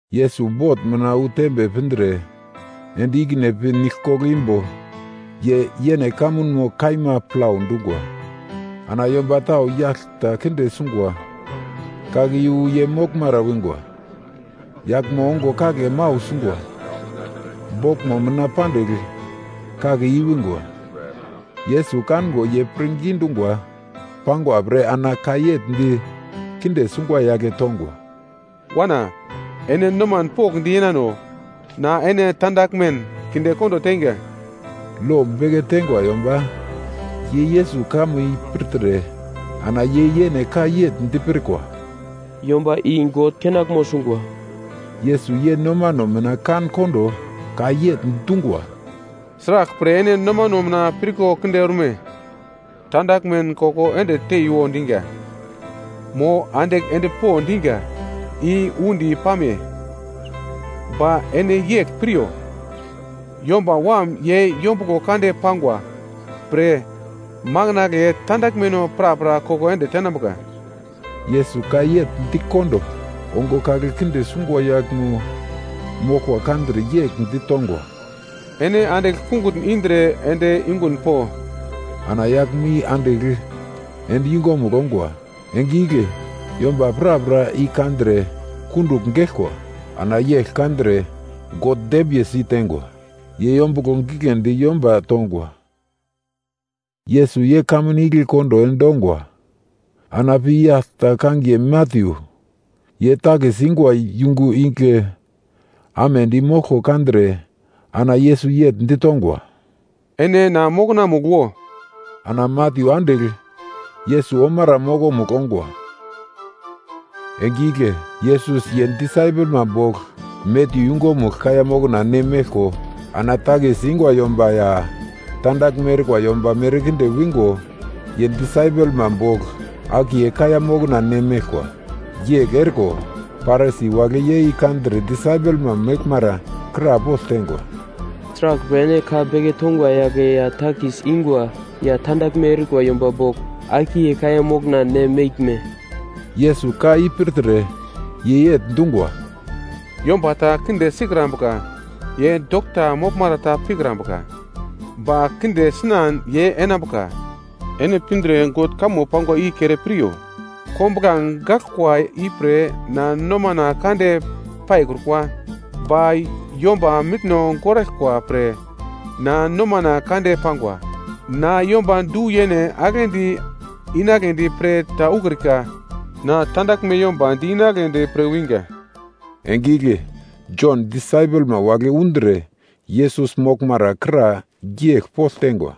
Yesus bot mina wu tembe pindre, ende ikine pi nigl koglo imbo ye yene kamunmo kaima plau dungwa. Ana yomba tau yagl ta kinde sungwa kake yu ye moglmara wingwa, yaglmo ongo kagle mau sungwa boglmo mina pandigl kake i-wingwa. Yesus kango ye pirngi dingwa pangwa pre ana ka yegl di kinde sungwa yagle tongwa, “Wana, ene noman pokndi yenano. Na ene tandaglmen kindekondo teinga.” Lo beke teingwa yomba ye Yesus kamo i pirtre ana ye yene ka yegl dipirkwa, “Yomba i God kenaglmo sungwa.” Yesus ye nomano mina kan-kondo ka yegl dungwa, “Sraglpre ene nomano mina pirko kinde orme? Tandaglmen koko ende teiwo diga, mo andigl ende po diga i undi pame? Ba ene yegl piryo, Yomba Wam ye yombuglo kande pangwa pre, makandle tandaglmeno prapra koko ende tenambuka.” Yesus ka yegl dikondo, ongo kagle kinde sungwa yaglmo moglko kandre yegl ditongwa, “Ene andigl kungutn indre ende yungun po.” Ana yaglmo i andigl ende yungumugl ongwa. Enge igle yomba prapra i kandre kundugl geglkwa. Ana yegl kandre God dembiye si teingwa. Ye yombuglo giglendi yomba tongwa. Yesus ye kamun igle kondo endongwa, ana pi yagl ta kangiye Matyu, ye takis ingwa yungu igle amedi moglko kandre ana Yesus yegl ditongwa, “Ene na mokonamugl wo.” Ana Matyu andigl Yesus omara mokomugl ongwa. Enge igle Yesus ye disaipelma bogl Matyu yungumugl kaiya mokna ne meglko ana takis ingwa yomba ya tandaglme erikwa yomba merkinde wingo ye disaipelma bogl akiye kaiya mokna ne meglkwa. Yegl eriko, Parisi wagle ye i kandre disaipelma meglmara krapogl teingwa, “Sraglpre ene ka beke tongwa yagle ye takis ingwa ya tandaglme erikwa yomba bogl akiye kaiya mokna ne meglme?” Yesus ka i pirtre ye yegl dungwa, “Yomba ta kinde sikrambuka ye dokta moglmara ta pikrambuka, ba kinde sinan ye enambuka. Ene pindre God kamo pangwa i kere piryo, ‘Kombuglange gaglkwa ipre na nomana kande paikrukwa, ba yomba mitno goraglkwa pre na nomana kande pangwa.’ Na yomba du-yene aglendi inagledi pre ta ukrika, na tandaglme yomba di-inagledi pre winga.” Enge igle Jon disaipelma wagle undre Yesus moglmara kra yegl pogl teingwa,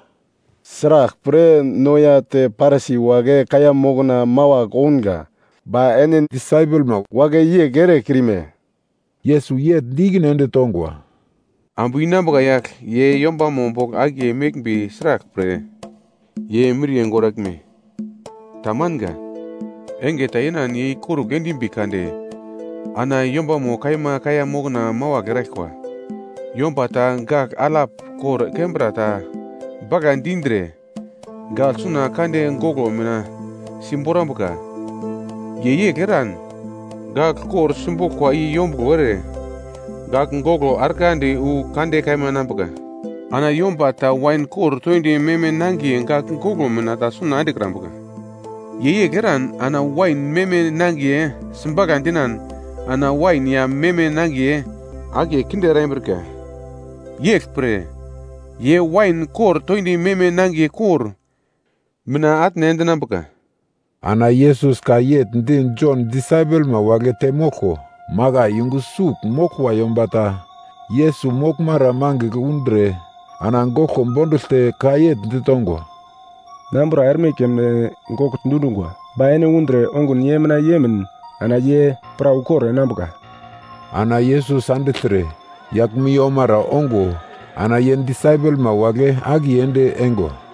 “Sraglpre no ya te Parisi wagle kaiya mokna mawagl ounga, ba ene disaipelma wagle yegl erekrime?” Yesus yegl di ikine ende tongwa, “Ambu inambuka yagl ye yombama bogl akiye meglmbi sraglpre ye miriye goraglme? Tamanga. Enge ta yenan ye ikorugl endimbi kade ana yombamo kaima kaiya mokna mawagl eraglkwa. “Yomba ta gagl alap kor kembra ta bagladi indre, gagl suna kande goglo mina simborambuka. Ye yegl eran, gagl kor simboglkwa i yombuglo ere gagl goglo arglandi wu kande kaima enambuka. Ana yomba ta wain kor toindi meme nangiye gagl goglo mina ta suna endekrambuka. Ye yegl eran ana wain meme nangiye sibagla dinan ana wain ya meme nangiye akiye kinde erambrika. Yeglpre, ye wain kor toindi meme nangiye kor mina atne endinambuka.” Ana Yesus ka yegl di Jon disaipelma wagle temoglko, makai yungu sugl moglkwa yomba ta, Yesus moglmara mangigl undre ana goglko bonduglte ka yegl ditongwa, “Na ambura erme keme gogl dundungwa. Ba ene undre ongun ye mina yemin ana ye pra ukor enambuka.” Ana Yesus andigltre yaglmo i omara ongo, ana ye disaipelma wagle akiye ende eingwa.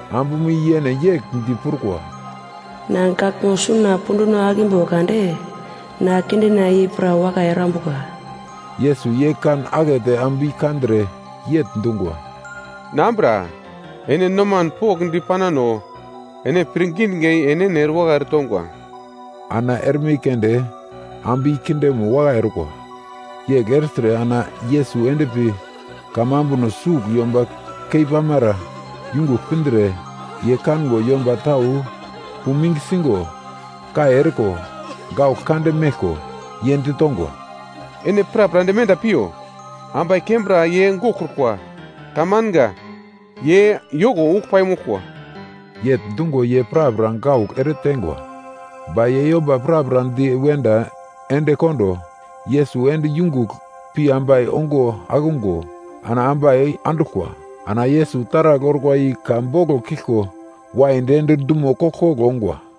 Ambumo yene yegl di prukwa, “Na gaglmo suna punduno akimbo kade, na kindena i pra wakai erambuka.” Yesus ye kan akete ambu i kandre yegl dungwa, “Na ambura, ene noman pokndi panano. Ene pirngi dinga i enene erewakai eretongwa.” Ana erme keunde ambu i kindemo wakai orkwa. Yegl ertre ana Yesus endpi kamambuno sugl yomba keipamara yungugl pindre, ye kango yomba tau puming sigo, kai eriko, gaugl kande meglko, ye ditongwa, “Ene prapra ende wenda piyo. Ambai kembra ye goglkrukwa, tamanga. Ye yoko ugl paimoglkwa.” Yegl dungo ye prapra gaugl ereteingwa. Ba ye yomba prapra di wenda endekondo, Yesus ende yungugl pi ambai ongo akungo ana ambai anduglkwa. Ana Yesus taragl orkwa i ka boglo kiglko waidi ende dumo koglkoglo ongwa.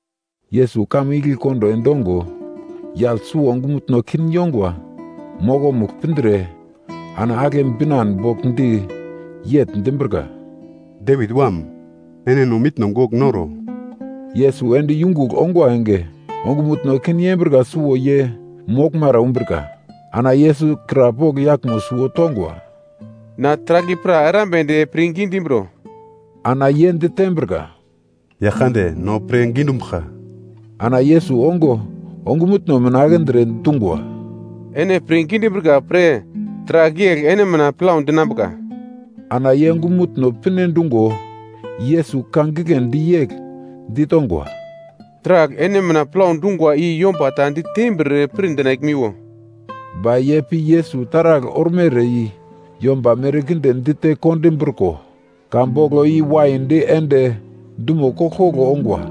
Yesus kamun igle kondo endongo, yagl suwo ongumutno kin yongwa mokomugl pindre ana agle binan bogl di yegl dimbrika, “Devit Wam, ene no mitno gogl noro!” Yesus ende yungugl ongwa enge, ongumutno kin yembrika suwo ye moglmara wimbrika. Ana Yesus krapogl yaglmo suwo tongwa, “Na taragl i pra erambedi pirngi dimbro?” Ana ye ditembrika, “Yaglkande, no pirngi dumbuglka.” Ana Yesus ongo ongumutno mina akindre dungwa, “Ene pirngi dimbrika pre, taragl yegl ene mina plau dinambuka.” Ana ye ongumutno pinedungo, Yesus ka giglendi yegl ditongwa, “Taragl ene mina plau dungwa i yomba ta ditembir pirdinaglmiwo.” Ba ye pi Yesus taragl ormere i yomba merkinde dite kondimbriko ka boglo i waidi ende dumo koglkoglo ongwa.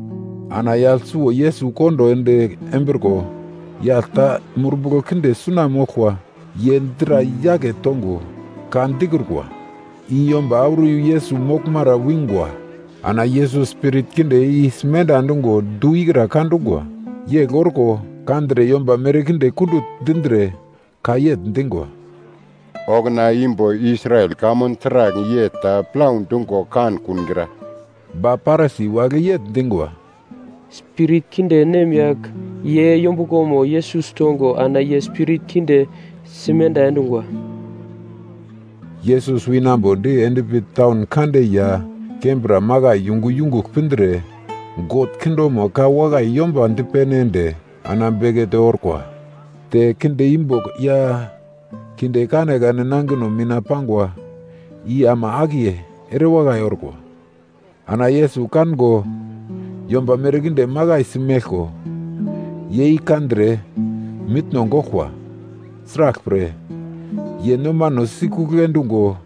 Ana yagl suwo Yesus kondo ende embriko, yagl ta spirit kinde suna moglkwa, ye dra yake tongo ka dikrukwa. I yomba auro yu Yesus moglmara wingwa. Ana Yesus spirit kinde i simenda endungo, du ikra ka dungwa. Yegl orko kandre yomba merkinde kundugl dindre ka yegl dingwa, “Okuna imbo Israel kamun taragl yegl ta plau dungo kankungra.” Ba Parisi wagle yegl dingwa, “Spirit kinde nemyagl ye yombuglomo Yesus tongo ana ye spirit kinde simenda endungwa.” Yesus winambodi endpi taun kande ya kembra makai yungu yungugl pindre, God kingdomo ka wakai yomba dipene ende ana bekete orkwa. Te kinde imbo ya kinde kanekane nangino mina pangwa i ama akiye erewakai orkwa. Ana Yesus kango yomba merkinde makaisi meglko, ye i kandre mitno goglkwa. Sraglpre, ye nomano sikugl endungo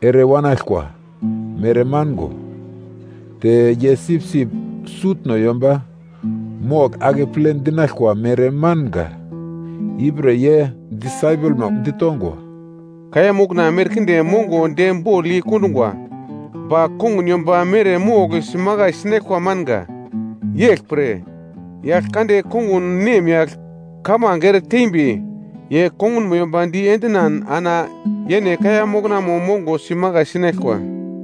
ere wanaglkwa mere mango, te ye sipsip sutno yomba mogl akeple dinaglkwa mere manga. Ipre ye disaipelma ditongwa, “Kaiya mokna merkinde mongo de bogl yei kondungwa, ba kongun yomba mere mogl simakai sinaglkwa manga. Yeglpre, Yaglkande kongun nemyagl kamange ere teimbi, ye kongunmo yomba di endinan ana yene kaiya moknamo mongo simakai sinaglkwa.”